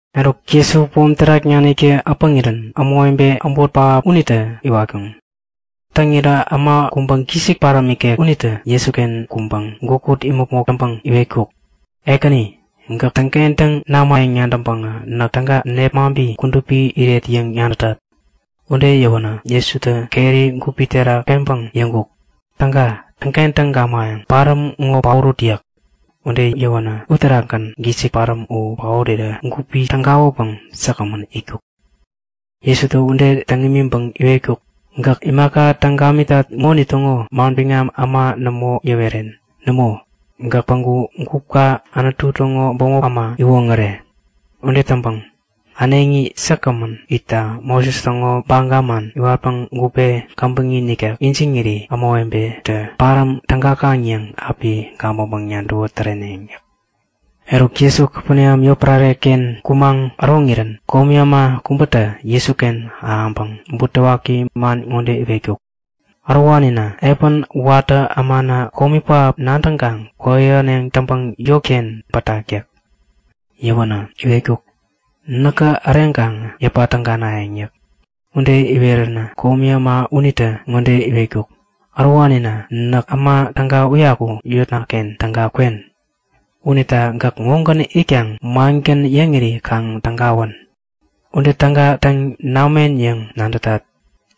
Eruk, Jesutä pom terak naniktä äpäŋirän ämawebe äbot pähap unitä iwatkuŋ. Täŋirä äma kubä gisik paräm ikek unitä Jesuken kuŋpäŋ gukut imäpmok täŋpäŋ iwetkuk; Ekäni, gäk täŋkentäŋ namayäŋ nadäŋpäŋä näk täga nepmaŋpi kudupi iret yäŋ nadätat. Ude yäwänä Jesutä keri gupi terak peŋpäŋ yäŋkuk; Täga täŋkentäŋ gamayäŋ. Paräm ŋo paorut! yäk. Ude yäwänä uterakgän gisik paräm u paorirä gupi tägawänpäŋ säkgämän itkuk. Jesutä ude täŋ imiŋpäŋ iwetkuk; Gäk imaka täŋ gamitat ŋonitäŋo manbiŋam äma nämo yäweren. Nämo, gäk päŋku gupka Anutu täŋo bämop äma iwoŋäre. Ude täŋpäŋ äneŋi säkgämän itta Moses täŋo baga man iwatpäŋ gupe käbäŋi nikek ijiŋiri ämawebetä paräm tägakaŋ yäŋ api gabäŋpäŋ-nadäwä täreneŋ yäk. Eruk Jesu Kapeneam yotpärare-ken kumaŋ äroŋirän komi äma kubätä Jesuken ahäŋpäŋ butewaki man ŋode iwetkuk; Ärowanina! Epän watä ämana komi pähap nadäŋpäŋ kwäyähäneŋ täŋpäŋ yotken pätak yäk. Yäwänä iwetkuk; Näkä äreŋkaŋä yäpa täganayäŋ yäk. Ude iweränä komi äma unitä ŋode iwetkuk; Ärowanina, näk äma täga uyaku yotna-ken täga kwen. Unita gäk ŋogän itkaŋä mangän yäŋiri kaŋ tägawän! Ude täga täŋ namen yäŋ nadätat.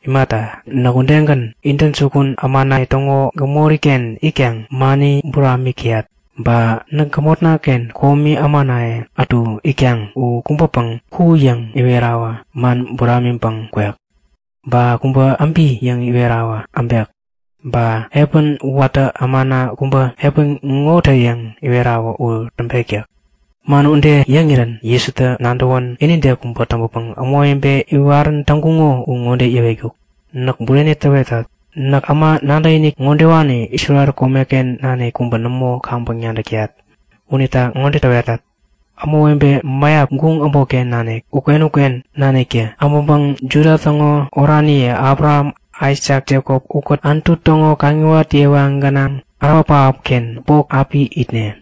Imata, näk udegän, intäjukun ämanaye täŋo gämori-ken itkaŋ mani buramik täyat. Ba näk gämotna-ken komi ämanaye ätu itkaŋ. U kubäpäŋ, Ku! yäŋ iwerawä, man buramiŋpäŋ kwek. Ba kubä, Äbi! yäŋ iwerawä, äbek. Ba epän watä ämana kubä, Epän ŋo tä! yäŋ iwerawä u täŋpek yäk. Man ude yäŋirän Jesutä nadäwän inide kubä täŋpäpäŋ ämawebe iwarän täŋkuŋo u ŋode yäwetkuk; Näk bureni täwetat. Näk äma nadäkinik ärowani ŋodewani Isrel komeken nanik kubä nämo kaŋpäŋ nadäk täyat! Unita ŋode täwetat; Ämawebe mäyap guŋ äbotken nanik uken-uken naniktä abäŋpäŋ Juda täŋo oraniye Abraham, Aisak, Jekop ukät Anutu täŋo kaŋiwat yewa gänaŋ ärawa pähapken bok api itneŋ.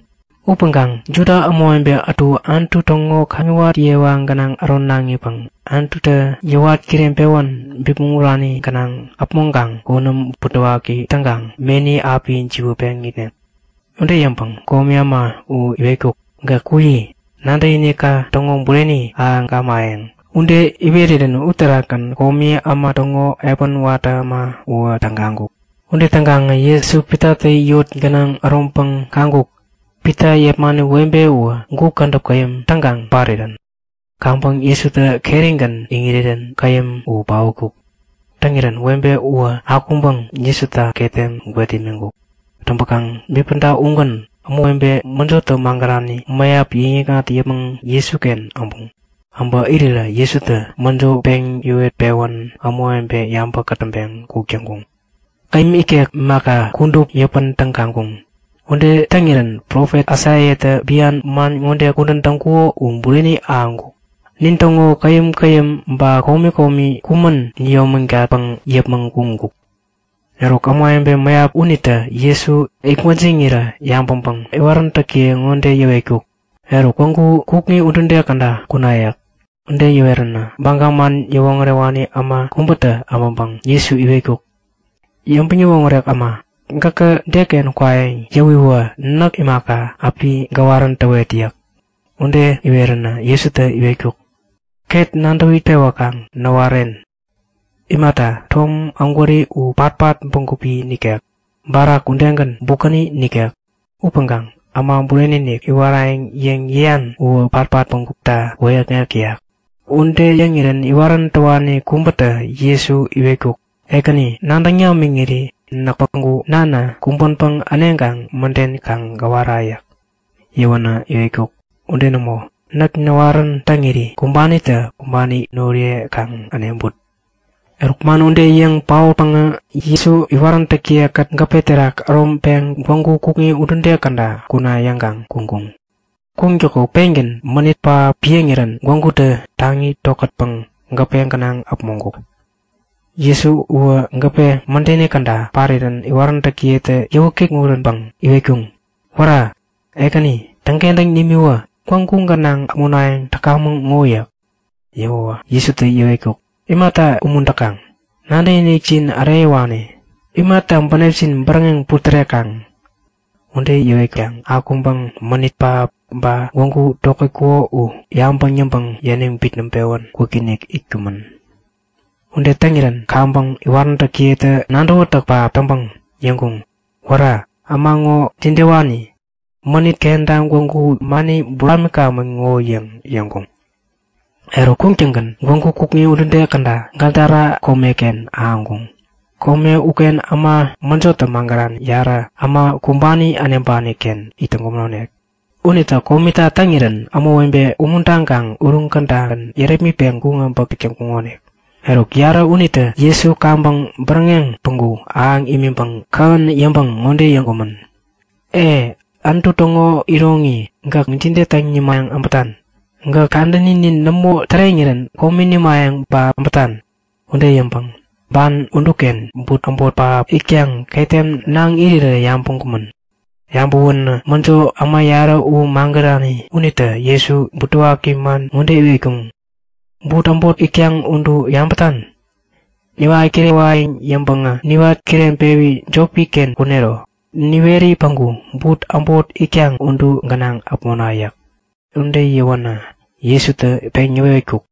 Upäŋkaŋ Juda ämawebe ätu Anutu täŋo kaŋiwat yewa gänaŋ äronaŋipäŋ Anututä yäwat kireŋpewän bipmäŋ urani gänaŋ äpmoŋkaŋ konäm butewaki täŋkaŋ meni api jiwätpeŋ itneŋ. Ude yäŋpäŋ komi äma u iwetkuk; Gäk kuyi. Nadäkinikka täŋo bureni ahäŋ gamayäŋ. Ude iwerirän uterakgän komi äma täŋo epän watä äma uwä tägaŋkuk. Ude täŋkaŋä Jesu Pitatä yot gänaŋ äroŋpäŋ kaŋkuk; Pita yepmani webe uwä gup kädäp käyäm täŋkaŋ parirän. Kaŋpäŋ Jesutä kerigän iŋirirän käyäm u paotkuk. Täŋirän webe uwä akuŋpäŋ Jesuta ketem gwet imiŋkuk. Täŋpäkaŋ bipäda ugän ämawebe mäjotä magärani mäyap yäŋ-yäkŋat yäpmäŋ Jesuken äbuŋ. Äbä irirä, Jesutä mäjo peŋ yäwet-pewän ämawebe yabä kätäŋpeŋ kuk täŋkuŋ. Käyäm ikek imaka, kudup yäpän tägaŋkuŋ. Ude täŋirän profet Aisaiatä bian man ŋode kudän täŋkuko u bureni ahäŋkuk; Nintäŋo käyäm-käyäm ba komi komi kumän niyomägatpäŋ yäpmäŋ kuŋkuk. Eruk, ämawebe mäyap unitä Jesu itgwäjiŋirä yabäŋpäŋ iwaräntäkiye ŋode yäwetkuk; Eruk, gwägu kukŋi udude käda kuna! yäk. Ude yäweränä Baga man yäwoŋärewani äma kubätä abäŋpäŋä Jesu iwetkuk; Yäŋpäŋ-yäwoŋärek äma, gäkä deken kwayäŋ yäŋiwä näk imaka, api gäwarän täwet yäk. Ude iweränä Jesutä iwetkuk; Ket nadäwi pewäkaŋ näwaren. Imata, tom ägwäri u patpat bägupi nikek. Barak udegän, bukäni nikek. Upäŋkaŋ Äma Bureni-inik iwarayäŋ yäŋ yäyan uwä patpat bägupta wäyäkŋek täyak. Ude yäŋirän iwarän täwani kubätä Jesu iwetkuk; Ekäni, nadäŋ namiŋiri näk päŋku nana kumbänpäŋ äneŋkaŋ mäden kaŋ gäwara yäk. Yäwänä iwetkuk; Ude nämo! Näk näwarän täŋiri, kumbanitä kumbani noriye kaŋ äneŋput. Eruk man ude yäŋ paotpäŋä Jesu iwaräntäkiye-kät gäpe terak äroŋpeŋ gwägu kukŋi udude käda kuna yäŋkaŋ kuŋkuŋ. Kuŋtäko pengän mänit pähap piäŋirän gwägutä taŋi tokätpäŋ gäpe gänaŋ äpmoŋkuk. Jesu uwä gäpe mädeni käda parirän iwaräntäkiyetä yäwä kikŋuränpäŋ iwetkuŋ; Wära! Ekäni, täŋkentäŋ nimiwä! Gwägu gänaŋ äpmonayäŋ täkamäŋ ŋo! yäk. Yäwäwä Jesutä yäwetkuk; Imata umuntäkaŋ? Nadäkinikjin äreyäwani! Imata bänepjin bäräŋeŋ putärekaŋ? Ude yäwetkaŋ akuŋpäŋ mänit pähap ba gwägu tokätkuko u yabäŋ yäŋpäŋ yäniŋ bitnäŋpewän kwikinik itkumän. Ude täŋirän kaŋpäŋ iwaräntäkiyetä nadäwätäk pähap täŋpäŋ yäŋkuŋ; Wära! Äma ŋo jidewani? Mänit kenta gwägutä mani buramikamän ŋo! yäŋ yäŋkuŋ. Eruk kuŋtäŋgän gwägu kukŋi udude käda Gadara komeken ahäŋkuŋ. Kome uken äma mäjotä magärani yarä, äma kumbani äneŋpani-ken it täŋkumänonik. Unitä komita täŋirän ämawebe umuntaŋkaŋ uruŋ kädagän yärepmitpeŋ kuŋ abäŋ täk täŋkuŋonik. Eruk yarä unitä Jesu kaŋpäŋ bäräŋeŋ päŋku ahäŋ imiŋpäŋ kähän yäŋpäŋ ŋode yäŋkumän; Ee! Anutu täŋo iroŋi gäk jide täŋ nimayäŋ abätan? Gäk kadäninin nämo täreŋirän komi nimayäŋ ba abätan? Ude yäŋpäŋ ban uduken but äbot pähap itkaŋ ketem naŋ irirä yabäŋkumän. Yabäwänä mäjo, äma yarä u magärani unitä Jesu butewaki man ŋode iwetkuŋ; But äbot itkaŋ udu yabätan? Niwat kirewayäŋ yäŋpäŋä niwat kireŋpewi jopi-ken kunero. Niweri päŋku but äbot itkaŋ udu gänaŋ äpmona yäk. Ude yäwänä Jesutä peŋ yäwetkuk;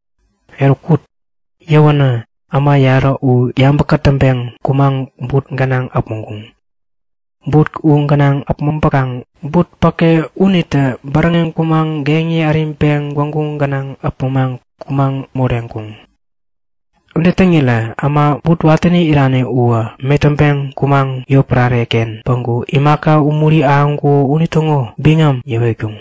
Eruk kut! Yäwänä äma yarä u yabä kätäŋpeŋ kumaŋ but gänaŋ äpmoŋkuŋ. But u gänaŋ äpmoŋpäkaŋ but päke unitä bäräŋeŋ kumaŋ geŋi äriŋpeŋ gwägu gänaŋ äpmoŋpäŋ kumäŋ moreŋkuŋ. Ude täŋirä äma but watäni irani uwä metäŋpeŋ kumaŋ yotpärare-ken päŋku imaka umuri ahäŋkuko unitäŋo biŋami yäwetkuŋ.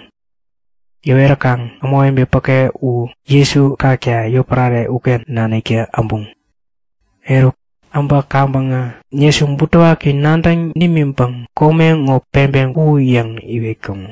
Yäweräkaŋ ämawebe päke u Jesu kakta yotpärare uken naniktä äbuŋ. Eruk äbä kaŋpäŋä Jesu butewaki nadäŋ nimiŋpäŋ kome ŋo peŋpeŋ ku! yäŋ iwetkuŋ.